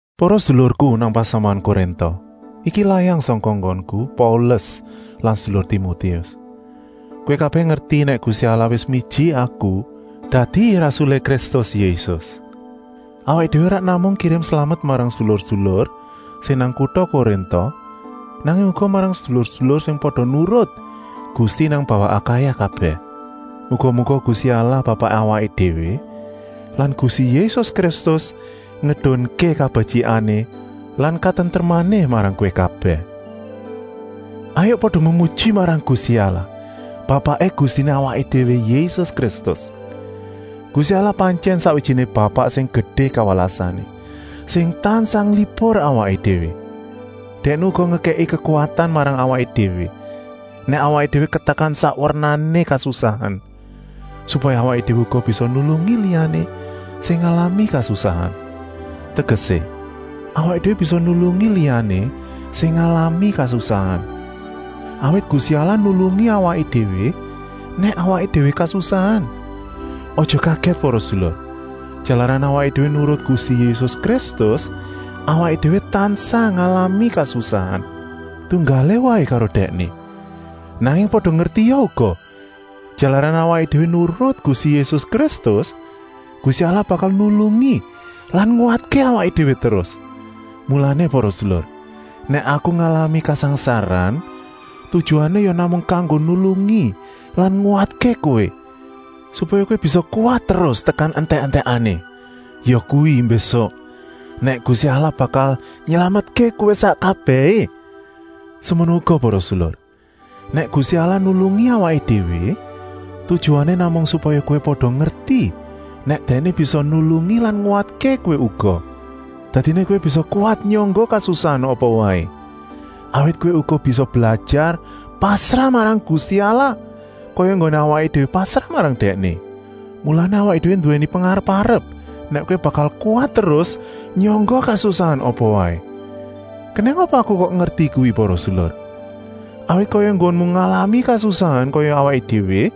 Para sedulurku nang pasamuan Korinta, iki layang sangka enggonku, Paulus lan sedulur Timotius. Kowé kabèh ngerti nèk Gusti Allah wis miji aku dadi rasulé Kristus Yésus. Awaké déwé ora namung kirim slamet marang sedulur-sedulur sing nang kuta Korinta, nanging uga marang sedulur-sedulur sing pada nurut Gusti nang bawah Akaya kabèh. Muga-muga Gusti Allah Bapaké awaké déwé lan Gusti Yésus Kristus ngedunké kabetyikané lan katentremané marang kowé kabèh. Hayuk pada memuji marang Gusti Allah, Bapaké Gustiné awaké déwé Yésus Kristus. Gusti Allah pantyèn sakwijiné Bapak sing gedé kawelasané, sing tansah nglipur awaké déwé. Dèkné uga ngekèki kekuwatan marang awaké déwé, nèk awaké déwé katekan sak wernané kasusahan, supaya awaké déwé uga bisa nulungi liyané sing ngalami kasusahan. Tegesé, awaké déwé bisa nulungi liyané sing ngalami kasusahan, awit Gusti Allah nulungi awaké déwé nèk awaké déwé kasusahan. Aja kagèt para sedulur, jalaran awaké déwé nurut Gusti Yésus Kristus, awaké déwé tansah ngalami kasusahan, tunggalé waé karo Dèkné. Nanging pada ngertia uga, jalaran awaké déwé nurut Gusti Yésus Kristus, Gusti Allah bakal nulungi lan nguwatké awaké déwé terus. Mulané para sedulur, nèk aku ngalami kasangsaran, tujuané ya namung kanggo nulungi lan nguwatké kowé, supaya kowé bisa kuwat terus tekan entèk-entèkané, yakuwi mbésuk, nèk Gusti Allah bakal nylametké kowé sak kabèhé. Semono uga para sedulur, nèk Gusti Allah nulungi awaké déwé, tujuané namung supaya kowé pada ngerti nèk Dèkné bisa nulungi lan nguwatké kowé uga. Dadiné kowé bisa kuwat nyangga kasusahan apa waé, awit kowé uga wis blajar pasrah marang Gusti Allah, kaya enggoné awaké déwé pasrah marang Dèkné. Mulané awaké déwé nduwèni pengarep-arep nèk kowé bakal kuwat terus nyangga kasusahan apa waé. Kenèng apa aku kok ngerti kuwi para sedulur? Awit kaya enggonmu ngalami kasusahan kaya awaké déwé,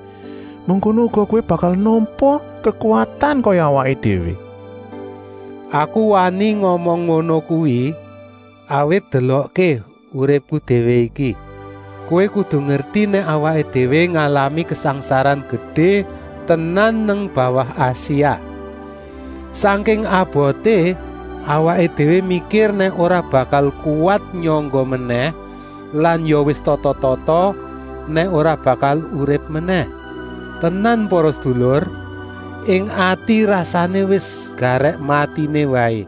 mengkono uga kowé bakal nampa kekuwatan kaya awaké déwé. Aku wani ngomong ngono kuwi, awit delokké uripku déwé iki. Kowé kudu ngerti nèk awaké déwé ngalami kasangsaran gedé tenan nang bawah Asia. Sangking aboté, awaké déwé mikir nèk ora bakal kuwat nyangga menèh lan ya wis tata-tata nèk ora bakal urip menèh. Tenan para sedulur, ing ati rasané wis garèk matiné waé,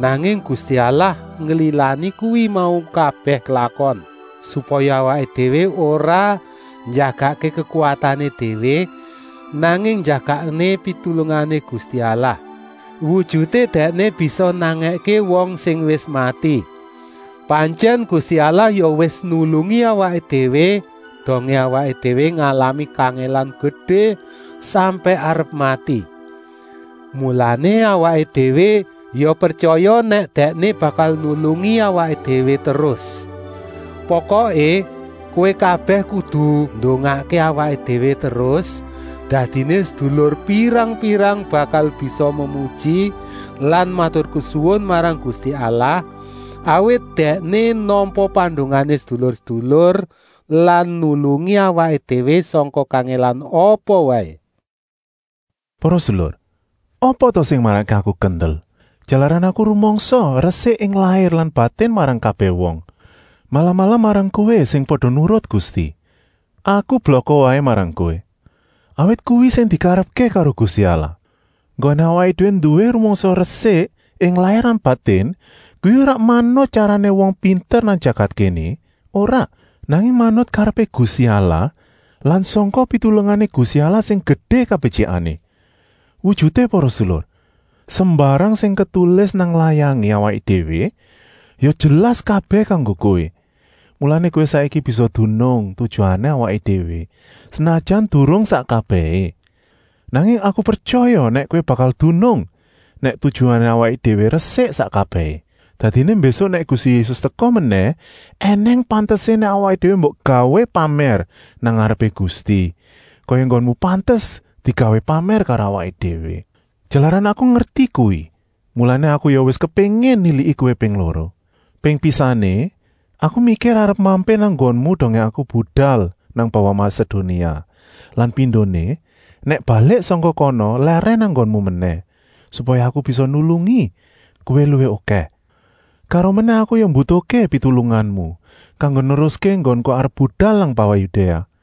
nanging Gusti Allah nglilani kuwi mau kabèh klakon, supaya awaké déwé ora njagakké kekuwatané déwé, nanging njagakké pitulungané Gusti Allah. Wujuté Dèkné bisa nangèké wong sing wis mati. Pantyèn Gusti Allah ya wis nulungi awaké déwé dongé awaké déwé ngalami kangèlan gedé sampèk arep mati. Mulané awaké déwé ya pretyaya nèk Dèkné bakal nulungi awaké déwé terus. Pokoké, kowé kabèh kudu ndongakké awaké déwé terus, dadiné sedulur pirang-pirang bakal bisa memuji lan maturkesuwun marang Gusti Allah, awit Dèkné nampa pandongané sedulur-sedulur lan nulungi awaké déwé sangka kangèlan apa waé. Para sedulur, apa ta sing marakké aku kendel? Jalaran aku rumangsa resik ing lair lan batin marang kabèh wong, malah-malah marang kowé sing pada nurut Gusti. Aku blaka marang kowé, awit kuwi sing dikarepké karo Gusti Allah. Enggoné awaké déwé nduwé rumangsa resik ing lair lan batin kuwi ora manut tyarané wong pinter nang jagat kéné, ora, nanging manut karepé Gusti Allah lan sangka pitulungané Gusti Allah sing gedé kabetyikané. Wujuté para sedulur, sembarang sing ketulis nang layangé awaké déwé ya jelas kabèh kanggo kowé, mulané kowé saiki bisa dunung tujuané awaké déwé, senajan durung sak kabèhé. Nanging aku pretyaya nèk kowé bakal dunung nèk tujuané awaké déwé resik sak kabèhé. Dadiné mbésuk nèk Gusti Yésus teka menèh ènèng pantesé nèk awaké déwé mbok gawé pamèr nang ngarepé Gusti, kaya enggonmu pantes digawé pamèr karo awaké déwé. Jalaran aku ngerti kuwi, mulané aku ya wis kepéngin niliki kowé ping loro. Ping pisané aku mikir arep mampir nang nggonmu dongé aku budal nang bawah Masedonia lan pindoné nèk balik sangka kana lèrèn nang nggonmu menèh, supaya aku bisa nulungi kowé luwih okèh. Karomenèh aku ya mbutuhké pitulunganmu kanggo neruské enggonku arep budal nang bawah Yudéa.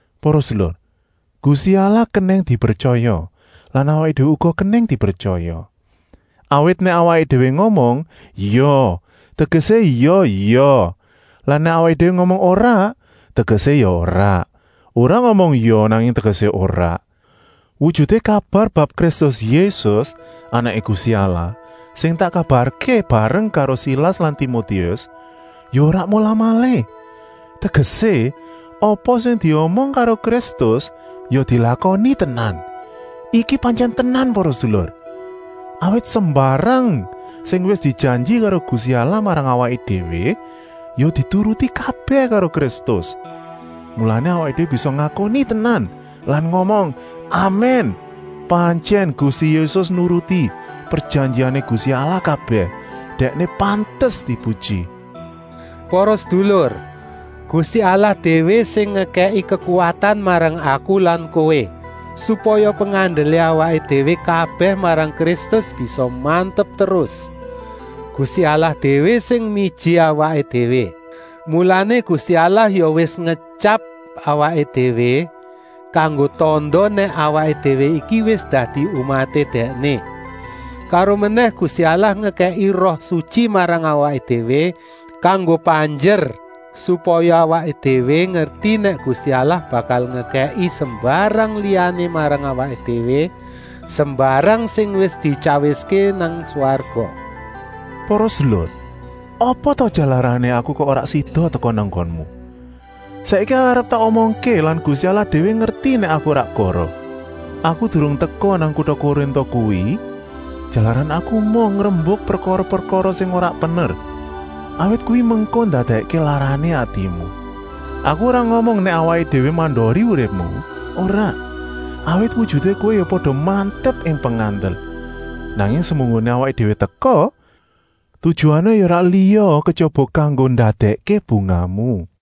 Para sedulur, Gusti Allah kenèng dipretyaya lan awaké déwé uga kenèng dipretyaya. Awit nèk awaké déwé ngomong “ya” tegesé ya “ya” lan nèk awaké déwé ngomong “ora” tegesé ya “ora.” Ora ngomong “ya” nanging tegesé “ora.” Wujuté kabar bab Kristus Yésus, Anaké Gusti Allah, sing tak kabarké bareng karo Silas lan Timotius, ya ora molah-malih. Tegesé, apa sing diomong karo Kristus ya dilakoni tenan. Iki pantyèn tenan para sedulur, awit sembarang sing wis dijanji karo Gusti Allah marang awaké déwé, ya dituruti kabèh karo Kristus. Mulané awaké déwé bisa ngakoni tenan lan ngomong “Amèn,” pantyèn Gusti Yésus nuruti prejanjiané Gusti Allah kabèh, Dèkné pantes dipuji. Para sedulur, Gusti Allah déwé sing ngekèki kekuwatan marang aku lan kowé, supaya pengandelé awaké déwé kabèh marang Kristus bisa mantep terus. Gusti Allah déwé sing miji awaké déwé. Mulané Gusti Allah ya wis ngetyap awaké déwé, kanggo tanda nèk awaké déwé iki wis dadi umaté Dèkné. Karomenèh Gusti Allah ngekèki Roh Sutyi marang awaké déwé kanggo panjer, supaya awaké déwé ngerti nèk Gusti Allah bakal ngekèki sembarang liyané marang awaké déwé, sembarang sing wis dityawiské nang swarga. Para sedulur, apa ta jalarané aku kok ora sida teka nang nggonmu? Saiki arep tak omongké lan Gusti Allah déwé ngerti nèk aku ora goroh. Aku durung teka nang kuta Korinta kuwi, jalaran aku emoh ngrembuk prekara-prekara sing ora pener, awit kuwi mengko ndadèkké larané atimu. Aku ora ngomong nèk awaké déwé mandori uripmu, ora, awit wujuté kowé ya pada mantep ing pengandel. Nanging semunggoné awaké déwé teka, tujuané ya ora liya kejaba kanggo ndadèkké bungahmu.